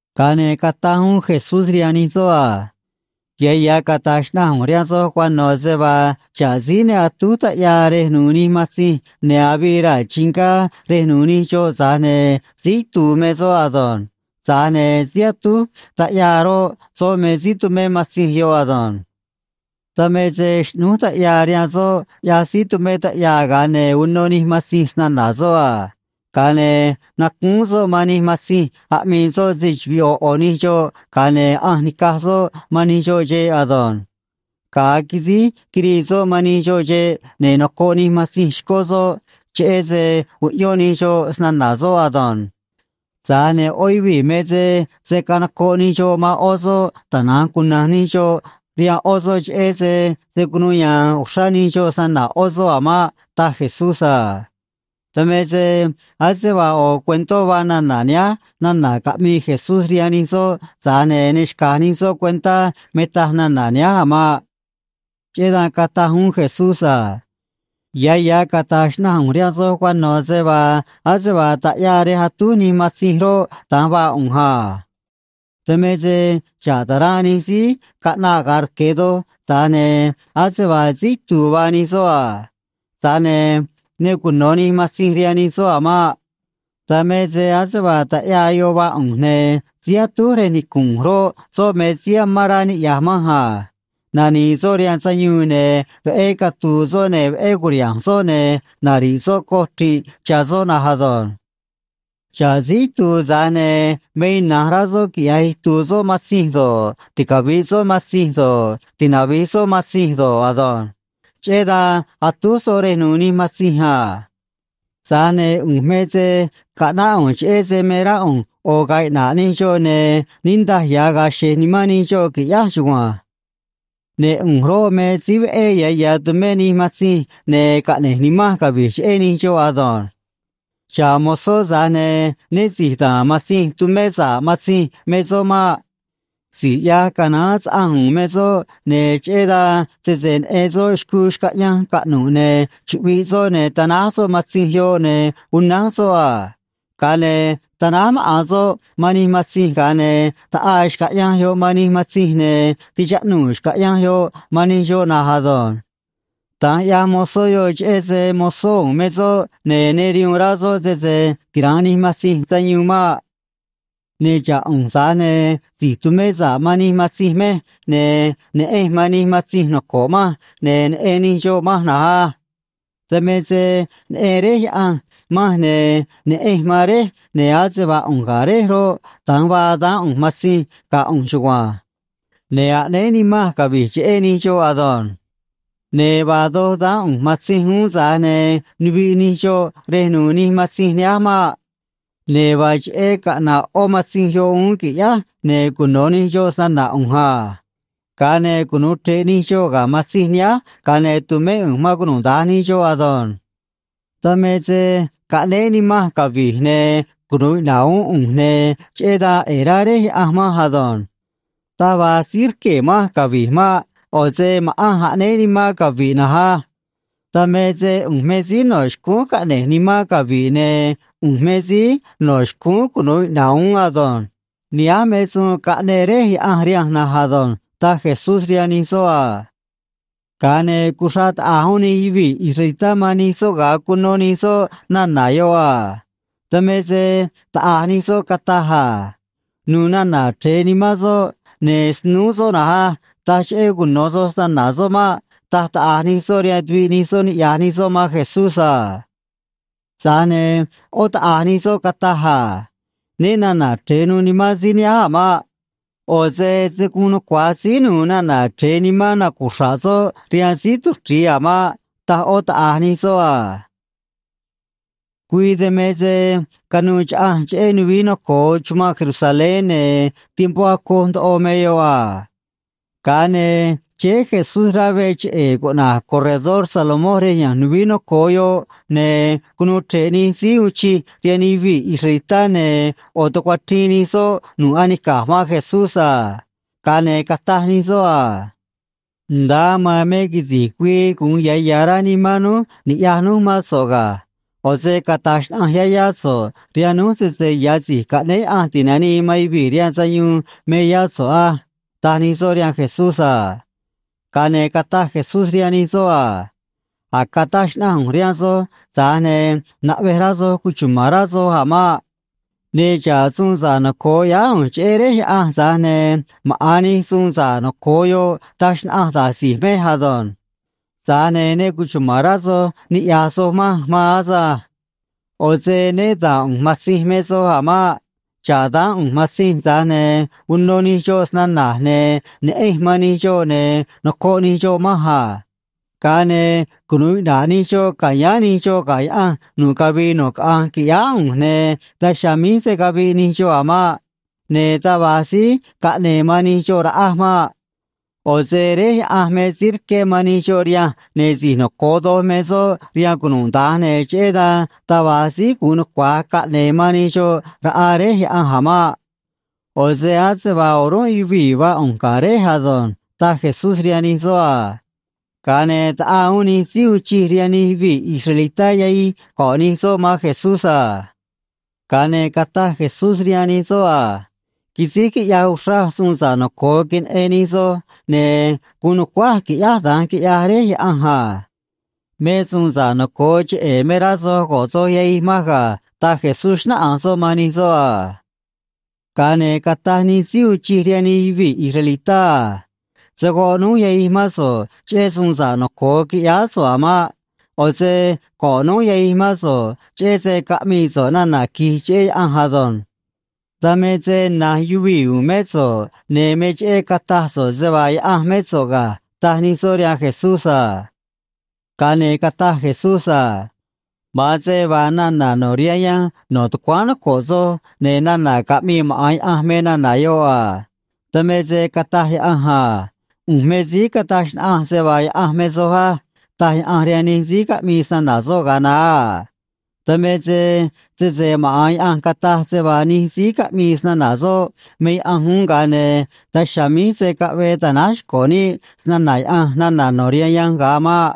Ga̱a ne̱ cataj uún Jesús rihaan nij soꞌ a: ―Ya̱ ya̱ cata̱j xnaꞌanj ꞌu̱nj rihaan soj cuano̱ se vaa xa̱ꞌ síí ne atúj taꞌyaa rej nu̱u̱ nij matzinj ne̱ avii raa̱ chingá rej nu̱u̱ nij xoꞌ, tza̱j ne̱ síí itu̱u̱ me soꞌ ado̱nj. Tza̱j ne̱ síí atúj taꞌyaa roꞌ, soꞌ me síí tumé matzinj yoꞌ ado̱nj. Dan me se xꞌnúj taꞌyaa rihaan soꞌ, ꞌyaj síí tumé taꞌyaa, ga̱a ne̱ uno nij matzinj snana̱ soꞌ a. Ga̱a ne̱ nacúún soꞌ man nij matzinj aꞌmii soꞌ se‑chuvi̱i ꞌo̱ ꞌo̱ nij xoꞌ, ga̱a ne̱ ꞌanj nica̱j soꞌ man nij xoꞌ xeꞌ ado̱nj. Ga̱a quisíj quirii soꞌ man nij xoꞌ xeꞌ, ne̱ noco̱ꞌ nij matzinj xcó soꞌ, cheꞌé se uꞌyón nij xoꞌ snana̱ soꞌ ado̱nj. Tza̱j ne̱ ꞌó yuvii̱ me se se̱ canocoꞌ nij xoꞌ man ꞌó soꞌ, tana̱nj cuna̱nj nij xoꞌ rihaan ꞌó soꞌ, cheꞌé se se̱ cunuu ya̱a̱n uxrá nij xoꞌ snana̱ ꞌó soꞌ a̱ maꞌ ―taj Jesús a. Dan me se ase vaa ꞌo̱ cuentó vaa nana̱ nihánj nana̱ caꞌmii Jesús rihaan nij soꞌ, tza̱j ne̱ ne xca̱j nij soꞌ cuentá me taj nana̱ nihánj a̱ maꞌ. Cheꞌé dan cataj uún Jesús a: ―Ya̱ ya̱ cata̱j xnaꞌanj ꞌu̱nj rihaan soj cuano̱ se vaa ase vaa taꞌyaa rej atúj nij matzinj roꞌ, da̱nj vaa ꞌu̱nj a. Dan me se xa̱ꞌ ta̱ranꞌ nij síí caꞌnaꞌ ga̱a rque̱ doj, tza̱j ne̱ ase vaa síí itu̱u̱ vaa nij soꞌ a. Tza̱j ne̱ ne cuno̱ nij matzinj rihaan nij soꞌ a̱ maꞌ. Dan me se ase vaa taꞌyaa yoꞌ vaa ꞌu̱nj, ne̱ síí atúj rej nicu̱nꞌ ꞌu̱nj roꞌ, soꞌ me síí amán rá niꞌya̱j manj a. Nani̱i̱ soꞌ rihaan sayuun, ne̱ veꞌé catu̱u̱ soꞌ, ne̱ veꞌé cu̱riha̱nj soꞌ, ne̱ nari̱ꞌ soꞌ coj chri̱nꞌ cha̱ soꞌ na̱nj ado̱nj. ’Xa̱ꞌ síí itu̱u̱, tza̱j ne̱ me ina̱nj rá soꞌ quiꞌya̱j itu̱u̱ soꞌ matzinj do̱ꞌ, ticavi̱ꞌ soꞌ matzinj do̱ꞌ, tinavi̱j soꞌ matzinj do̱ꞌ ado̱nj. Cheꞌé dan atúj soꞌ rej nu̱u̱ nij matzinj a. Tza̱j ne̱ ꞌu̱nj me se caꞌnáꞌ ꞌu̱nj cheꞌé se me rá ꞌu̱nj ꞌo̱ ga̱a̱ iꞌna̱ꞌ nij xoꞌ, ne̱ niꞌndaj ya̱ ga̱a̱ xe̱j nimán nij xoꞌ, qui̱ꞌyáj chugua̱nj. ’Ne̱ ꞌu̱nj roꞌ, me síí veꞌé ya̱ ya̱ tumej nij matzinj, ne̱ caꞌne̱j nimanj cavi̱j cheꞌé nij xoꞌ ado̱nj. Xa̱ꞌ mozó, tza̱j ne̱ né si̱j da̱a̱n matzinj tumé sa̱ꞌ matzinj me soꞌ maꞌ. Si̱j ꞌyaj canaán saꞌanj u̱u̱n me soꞌ, ne̱ cheꞌé dan sese neꞌen soꞌ xcuu xcaꞌyanj caꞌnu̱ꞌ, ne̱ chuꞌviꞌ soꞌ, ne̱ tanáj soꞌ matzinj yoꞌ, ne̱ unánj soꞌ a. Ga̱a ne̱ tanáj maꞌa̱n soꞌ man nij matzinj, ga̱a ne̱ ta̱ꞌaa xcaꞌyanj yoꞌ man nij matzinj, ne̱ ti̱chaꞌnuu̱ xcaꞌyanj yoꞌ man nij xoꞌ na̱nj ado̱nj. Da̱nj ꞌyaj mozó yoꞌ, cheꞌé se mozó u̱u̱n me soꞌ, ne̱ ne rihuun rá soꞌ sese quira̱nꞌ nij matzinj sayuun maꞌ. ’Ne̱ xa̱ꞌ ꞌu̱nj, tza̱j ne̱ si̱j tumé sa̱ꞌ man nij matzinj mej, ne̱ neꞌenj man nij matzinj noco̱ꞌ manj, ne̱ neꞌen nij xoꞌ manj na̱nj á. Dan me se neꞌen Réj Yaꞌanj manj, ne̱ neꞌenj man Réj, ne̱ ase vaa ꞌu̱nj ga̱ Réj roꞌ, da̱nj vaa daán ꞌu̱nj matzinj ga̱ ꞌu̱nj chugua̱nj. Ne̱ aꞌnéé nimanj cavi̱j cheꞌé nij xoꞌ ado̱nj. Ne̱ vaa doj daán ꞌu̱nj matzinj uún, tza̱j ne̱ nuviꞌ nij xoꞌ rej nu̱u̱ nij matzinj nihánj maꞌ. Ne̱ vaa cheꞌé caꞌna̱ꞌ ꞌó matzinj yoꞌ uún, qui̱ꞌyáj, ne̱ cuno̱ nij xoꞌ snana̱ ꞌu̱nj a. Ga̱a ne̱ cunu̱u chre̱ꞌ nij xoꞌ ga̱ matzinj nihánj, ga̱a ne̱ tu̱mé ꞌu̱nj man cunuda̱nj nij xoꞌ ado̱nj. ’Dan me se caꞌnéé nimanj cavi̱j, ne̱ cunu̱u iꞌna̱ꞌ uún ꞌu̱nj, ne̱ cheꞌé dan ꞌe̱e̱ rá Réj Yaꞌanj manj ado̱nj. Taj va̱j síí rquee̱ manj cavi̱j maꞌ. ꞌO̱ se ma̱ꞌanj aꞌnéé nimanj cavi̱j na̱nj á. Dan me se ꞌu̱nj me síí no̱ xcúún caꞌne̱j nimanj cavi̱j, ne̱ ꞌu̱nj me síí no̱ xcúún cunu̱u iꞌna̱ꞌ uún ado̱nj. Nihánj me suun caꞌneꞌ Réj Yaꞌanj rihanj na̱nj ado̱nj ―taj Jesús rihaan nij soꞌ a. Ga̱a ne̱ cuxraꞌ taꞌa̱j uún nij yuvii̱ israelitá man nij soꞌ, ga̱a cuno nij soꞌ nana̱ yoꞌ a. Dan me se taꞌa̱j nij soꞌ cataj a: ―Nu̱u̱ nana̱ chre̱e nimán soꞌ, ne̱ snúú soꞌ na̱nj á. Taj cheꞌé cuno̱ soj snana̱ soꞌ maꞌ ―taj taꞌa̱j nij soꞌ rihaan tuviꞌ nij soꞌ, niꞌya̱j nij soꞌ man Jesús a. Tza̱j ne̱ ꞌó taꞌa̱j nij soꞌ cataj a: ―Né na̱na̱ chre̱e nuû nimán síí nihánj a̱ maꞌ. ꞌO̱ se se̱ guun nucua̱j síí nu̱u̱ nana̱ chre̱e nimán nacuxra̱ꞌ soꞌ rihaan síí tuchri̱i a̱ maꞌ ―taj ꞌó taꞌa̱j nij soꞌ a. Güii dan me se canuû chaꞌanj cheꞌé nuvií noco̱o chumanꞌ Jerusalén, ne̱ tiempó acoj ndoꞌo me yoꞌ a. Ga̱a ne̱ chéé Jesús rá veꞌ cheꞌe̱e̱ cuꞌna̱j Corredor Salomón rej ya̱nj nuvií noco̱o yoꞌ, ne̱ cunuu chre̱ꞌ nij síí uun chij rihaan nij yuvii̱ israelitá, ne̱ ꞌo̱ tucuachriin nij soꞌ nu̱ꞌ anica̱j man Jesús a. Ga̱a ne̱ cataj nij soꞌ a: ―Nda̱a aman me quisi̱j güii gu̱un ya̱ ya̱ rá nimán núj ni̱ꞌyaj núj mán so̱ꞌ ga̱. ꞌO̱ se cata̱j xnaꞌanj yá yá so̱ꞌ rihaan núj sese ya̱ Si̱j Caꞌnéé Yaꞌanj Ti̱nanii man Yuvii̱ rihaan Sayuun me yá so̱ꞌ á ―taj nij soꞌ rihaan Jesús a. Ga̱a ne̱ cataj Jesús rihaan nij soꞌ a: ―A̱j cataj xnaꞌanj ꞌu̱nj rihaan soj, tza̱j ne̱ naꞌvej rá soj cuchuma̱n rá soj a̱ maꞌ. Ne̱ xa̱ꞌ suun sa̱ꞌ noco̱o ꞌyáá ꞌu̱nj cheꞌé Réj Yaꞌanj, tza̱j ne̱ maꞌa̱n nij suun sa̱ꞌ noco̱o yoꞌ taj xnaꞌanj da̱j si̱j mej ado̱nj. Tza̱j ne̱ ne cuchuma̱n rá soj ni̱ꞌyaj soj manj maan asânj. ꞌO̱ se né da̱a̱n ꞌu̱nj matzinj me soj a̱ maꞌ. Xa̱ꞌ daán ꞌu̱nj matzinj, tza̱j ne̱ uno nij xoꞌ snana̱j, ne̱ neꞌenj man nij xoꞌ, ne̱ nocoꞌ nij xoꞌ manj a. Ga̱a ne̱ cunu̱u iꞌna̱ꞌ nij xoꞌ ca̱yáán nij xoꞌ ga̱ Yaꞌanj nu̱ꞌ cavii nu̱ꞌ caꞌanj, qui̱ꞌyáá ꞌu̱nj, ne̱ daj chiha̱a̱ míj se̱ caviꞌ nij xoꞌ a̱ maꞌ. Ne̱ taj va̱j síí caꞌne̱e̱ man nij xoꞌ raꞌaj maꞌ. ꞌO̱ se Réj Yaꞌanj me síí rqué man nij xoꞌ rihanj, ne̱ si̱j noco̱o doj me soꞌ rihaan cunuda̱nj, ne̱ cheꞌé dan taj va̱j síí gu̱un nucua̱j caꞌne̱e̱ man nij xoꞌ raꞌa Réj Yaꞌanj a̱ maꞌ. ꞌO̱ se ase vaa o̱rúnꞌ yuvii̱ vaa ꞌu̱nj ga̱ Réj ado̱nj ―taj Jesús rihaan nij soꞌ a. Ga̱a ne̱ taꞌaa uún nij síí uun chij rihaan nij yuvii̱ israelitá yahij go̱ꞌ nij soꞌ man Jesús a. Ga̱a ne̱ cataj Jesús rihaan nij soꞌ a: ―Quisíj quiꞌyaj uxraj suun sa̱ꞌ noco̱o queneꞌen nij soj, ne̱ guun nu̱cuáj quiꞌyáj da̱nj, quiꞌyaj Réj Yaꞌanj a. Me suun sa̱ꞌ noco̱o cheꞌe̱ me rá soj go̱ꞌ soj yahij manj ga̱ ―taj Jesús, xnáꞌanj soꞌ man nij soꞌ a. Ga̱a ne̱ cataj nij síí uun chij rihaan nij yuvii̱ israelitá a: ―Se̱ goꞌ núj yahij mán so̱ꞌ cheꞌé suun sa̱ꞌ noco̱o quiꞌyáá so̱ꞌ a̱ maꞌ. ꞌO̱ se go̱ꞌ núj yahij mán so̱ꞌ cheꞌé se caꞌmii so̱ꞌ nana̱ qui̱j cheꞌé Yaꞌanj ado̱nj. Dan me se na̱nj yuvii̱ u̱u̱n mé so̱ꞌ, ne̱ me cheꞌé cataj so̱ꞌ se vaa Yaꞌanj mé so̱ꞌ ga̱ ―taj nij soꞌ rihaan Jesús a. Ga̱a ne̱ cataj Jesús a: ―Ma̱an se vaa nana̱ no̱ rihaan yanj no̱ tucuáán noco̱ꞌ soj, ne̱ nana̱ caꞌmii maꞌa̱n Yaꞌanj me nana̱ yoꞌ a. Dan me se cataj Yaꞌanj a: “ꞌU̱nj me síí cataj xnaꞌanj se vaa yaꞌanj me soj á”, taj Yaꞌanj rihaan nij síí caꞌmii snana̱ soꞌ ga̱a naá a. Dan me se sese maꞌa̱n Yaꞌanj cataj se vaa nij síí caꞌmii snana̱ soꞌ me yaꞌanj uún, ga̱a ne̱ daj chiha̱a̱ míj se̱ caꞌvee ta̱náj xco̱ níꞌ snana̱ Yaꞌanj nana̱ no̱ rihaan yanj ga̱a maꞌ.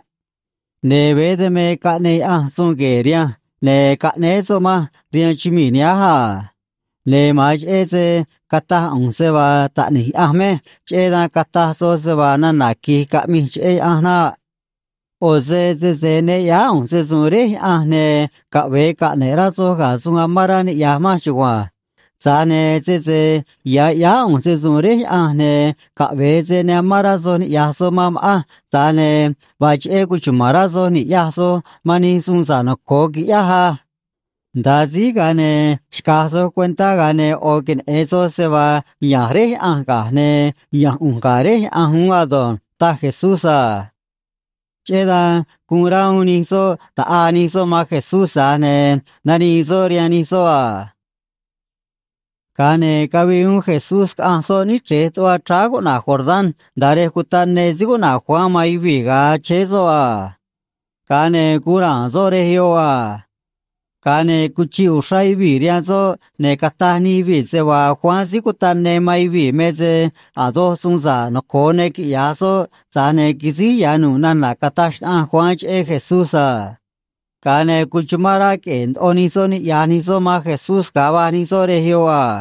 Ne̱ veé dan me caꞌneꞌ Yaꞌanj suun gue̱e̱ rihanj, ne̱ caꞌnéé soꞌ manj rihaan chumii̱ nihánj a. Ne̱ ma̱an cheꞌé se cataj ꞌu̱nj se vaa taꞌni̱j Yaꞌanj mej, cheꞌé dan cataj soj se vaa nana̱ qui̱j caꞌmij cheꞌé Yaꞌanj naꞌ. ꞌO̱ se sese ne ꞌyáá ꞌu̱nj se‑su̱u̱n Réj Yaꞌanj, ne̱ caꞌve̱e caꞌne̱ꞌ rá soj ga̱ suun amán rá niꞌya̱j manj chugua̱nj. Tza̱j ne̱ sese ya̱ ꞌyáá ꞌu̱nj se‑su̱u̱n Réj Yaꞌanj, ne̱ caꞌve̱e se ne amán rá soj niꞌya̱j soj man ma̱ꞌanj, tza̱j ne̱ vaa cheꞌé cuchuma̱n rá soj ni̱ꞌyaj soj man nij suun sa̱ꞌ noco̱o quiꞌyáj á. Nda̱a síj, ga̱a ne̱ xca̱j soj cuentá, ga̱a ne̱ ꞌo̱ queneꞌe̱n soj se vaa ya̱nj Réj Yaꞌanj ga̱j, ne̱ ya̱nj ꞌu̱nj ga̱ Réj Yaꞌanj uún ado̱nj ―taj Jesús a. Cheꞌé dan guun rá uún nij soꞌ ta̱ꞌaa nij soꞌ man Jesús, tza̱j ne̱ nanii soꞌ rihaan nij soꞌ a. Ga̱a ne̱ cavii uún Jesús caꞌanj soꞌ níchrej tuꞌva chráá cuꞌna̱j Jordán nda̱a rej cutaꞌ ne síí cuꞌna̱j Juan man yuvii̱ ga̱a chéé soꞌ a. Ga̱a ne̱ guun ra̱a̱n soꞌ rej yoꞌ a. Ga̱a ne̱ cuchiꞌ uxrá yuvii̱ rihaan soꞌ, ne̱ cataj nij yuvii̱ se vaa Juan Síí Cutaꞌ Ne man yuvii̱ me se a̱ doj suun sa̱ꞌ noco̱o ne quiꞌya̱j soꞌ, tza̱j ne̱ quisíj ya̱ nu̱ꞌ nana̱ cataj xnaꞌanj Juan cheꞌé Jesús a. Ga̱a ne̱ cuchumán rá queꞌe̱e̱ ndoꞌo nij soꞌ niꞌya̱j nij soꞌ man Jesús ga̱a va̱j soꞌ rej yoꞌ a.